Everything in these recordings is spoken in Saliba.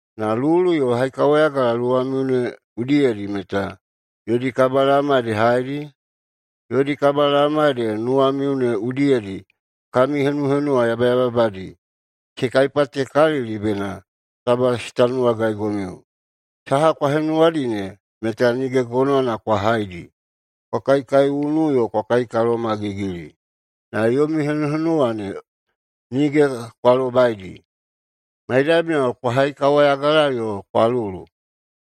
Na lulu yo haikawayagala luwamiu ne udiyedi meta yodi kabalaoma ede haedi? Yodi kabalaoma ede nuwamiu ne udiyedi kami henuhenuwa yabayababadi, se kaipatekalili bena taba se tanuwagaigomiu. Saha kwa henuwadi ne meta nige gonowana kwa haidi. Kwa kaikaiunu yo kwa kaikalomagigili, na yomi henuhenuwa ne nige kwa lobaidi. Maidamiyao kwa haikawayagala yo kwa lulu.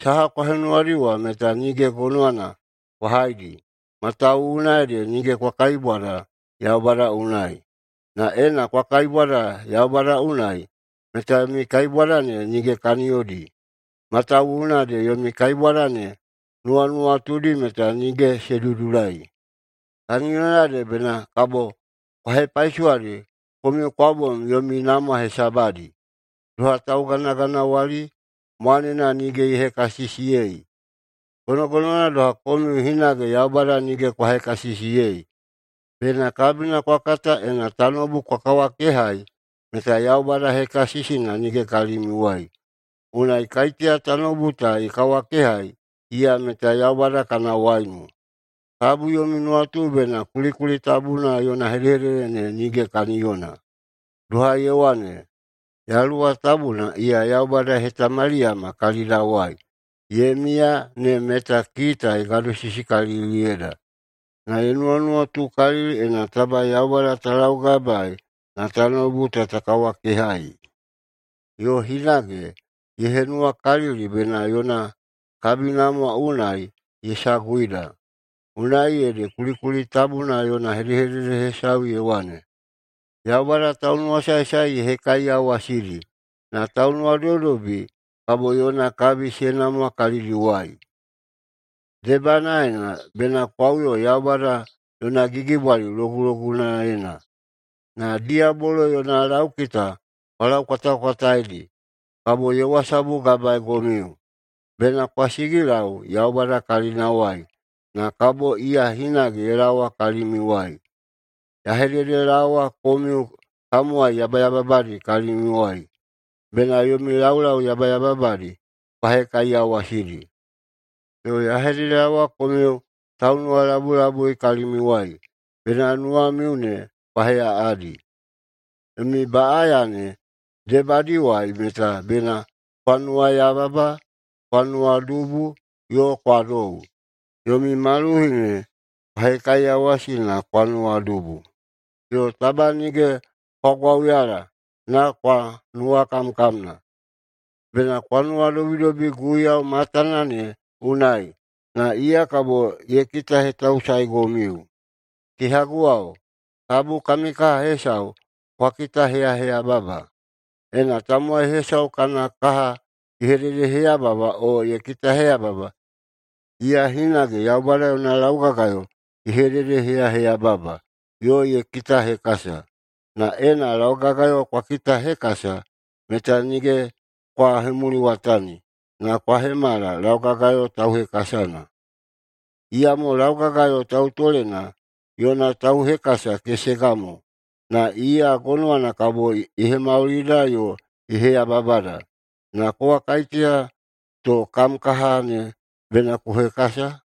Saha kwa henuwadi wa meta nige gonowana kwa haidi, matawuwuna ede nige kwa kaibwada Yaubada unai. Na ena kwa kaibwada Yaubada unai, meta yomi kaibwada ne nige kaniyodi, matawuwuna ede yomi kaibwada ne nuwanuwatudi meta nige se dudulai. Kaniyona ede bena kabo kwa hepaisowadi komiu kwa bom yomi namwa hesabadi. Doha tauganaganawali mwanena nige ye hekasisiyei, gonogonowana doha komiu hinage Yaubada nige kwa hekasisiyei. Bena kabina kwa kata, ena tanoubu kwa kawakehai, meta Yaubada hekasisina nige kalimiuwai. Unai kaiteya tanoubu ta ye kawakehai, iya meta Yaubada kana waiunu. Tabu yomi nuwatu bena kulikuli tabuna yona hedehedede ne nige kaniyona, doha ye wane, “Yaluwa Tabuna, iya Yaubada ye hetamaliyama kalidawai ye miya ne meta kita ye gadosisikaliliyeida, na ye nuwanuwatukalili ena taba Yaubada ta laugabaei na tanoubu ta ta kawakehai.” Yo hinage ye henuwakalili bena yona kabinamwa unai ye saguida, unai ede kulikuli tabuna yona hedehedede hesau ye wane, “Yaubada taunuwasaesae ye hekaiyawasidi, na taunuwadobidobi kabo yona kabi se namwa kalidiwai.” Debanaena bena kwa uyo Yaubada yona gigibwali logulogunaena, na diyabolo [yona laukita] kwa laukwatakwataidi, kabo ye wasabugabaeigomiu. Bena kwa sigilau Yaubada kalinawai, na kabo iya hinage ye laowa kalimiuwai. Ya hededelaowa komiu tamowai yabayababadi kalimiuwai, bena yomi laulau yabayababadi kwa hekaiyawasidi, yo ya hededelaowa komiu taunuwalabulabui kalimiuwai, bena nuwamiu ne kwa heꞌaꞌadi. [Yomi baꞌaya ne debadiwai meta] bena kwa nuwayababa, kwa nuwadubu, yo kwa dou. Yomi maluhi ne kwa hekaiyawasi na kwa nuwadubu, yo taba nige kwa gwauyala, na kwa nuwakamkamna. Bena kwa nuwadobidobi Guiyau matana ne unai, na iya kabo ye kitahetausaegomiu. Kehaguwao, tabu kami kaha hesau kwa hededeheyaheyababa. Ena tamowai hesau kana kaha ye hededeheyaheyababa o ye kitahekasa, iya hinage Yaubada yona laugagayo ye hededeheyaheyababa yo ye kitahekasa. Na ena laugagayo kwa kitahekasa, meta nige kwa hemuliwatani, na kwa hemala laugagayo tauhekasana. Iyamo laugagayo tautolena yo tauhekasana kesega mo, na iya gonowana kabo ye hemaulida yo ye heyababada. Na kowa kaiteya to kam kaha ne bena ku hekasa?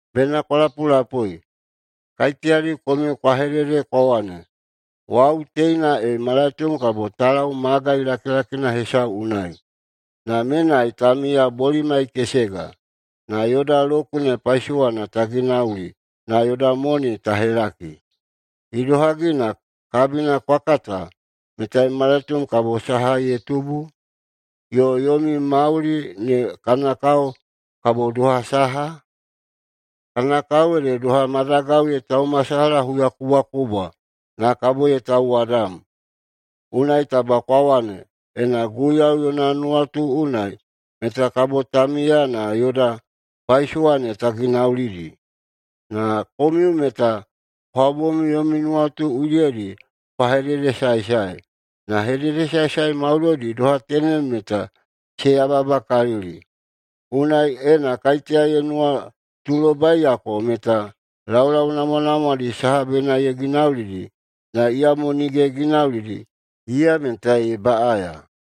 Bena kwa lapulapui, kaiteyadi komiu kwa hedede kwa wane, “Wau teina e malaitom kabo ta lau magai lakilakina hesau unai. Na menai ta miya bolimai kesega, na yoda kune paisowana ta ginauli na yoda moni ta helaki.” Idohagi na kabina kwa kata meta malaitom kabo saha ye tubu? Yo yomi mauli ne kana kao kabo doha saha? Kana kao ede doha madagau ye taumasalaha huyakubwakubwa na kabo ye tauwadam. Unai taba kwa wane, “Ena Guiyau yona nuwatu unai, meta kabo ta miya na yoda paisowa ne ta ginaulidi.” Na komiu meta kwa bom yomi nuwanuwatu udiyedi kwa hededesaesae. Na hededesaesae maudoidi doha tenem meta se yababakalili. Unai, ena kaiteya ye nuwatulobaiyako meta laulau namwanamwadi saha bena ye ginaulidi, na iyamo nige ye ginaulidi, iya meta ye baꞌaya.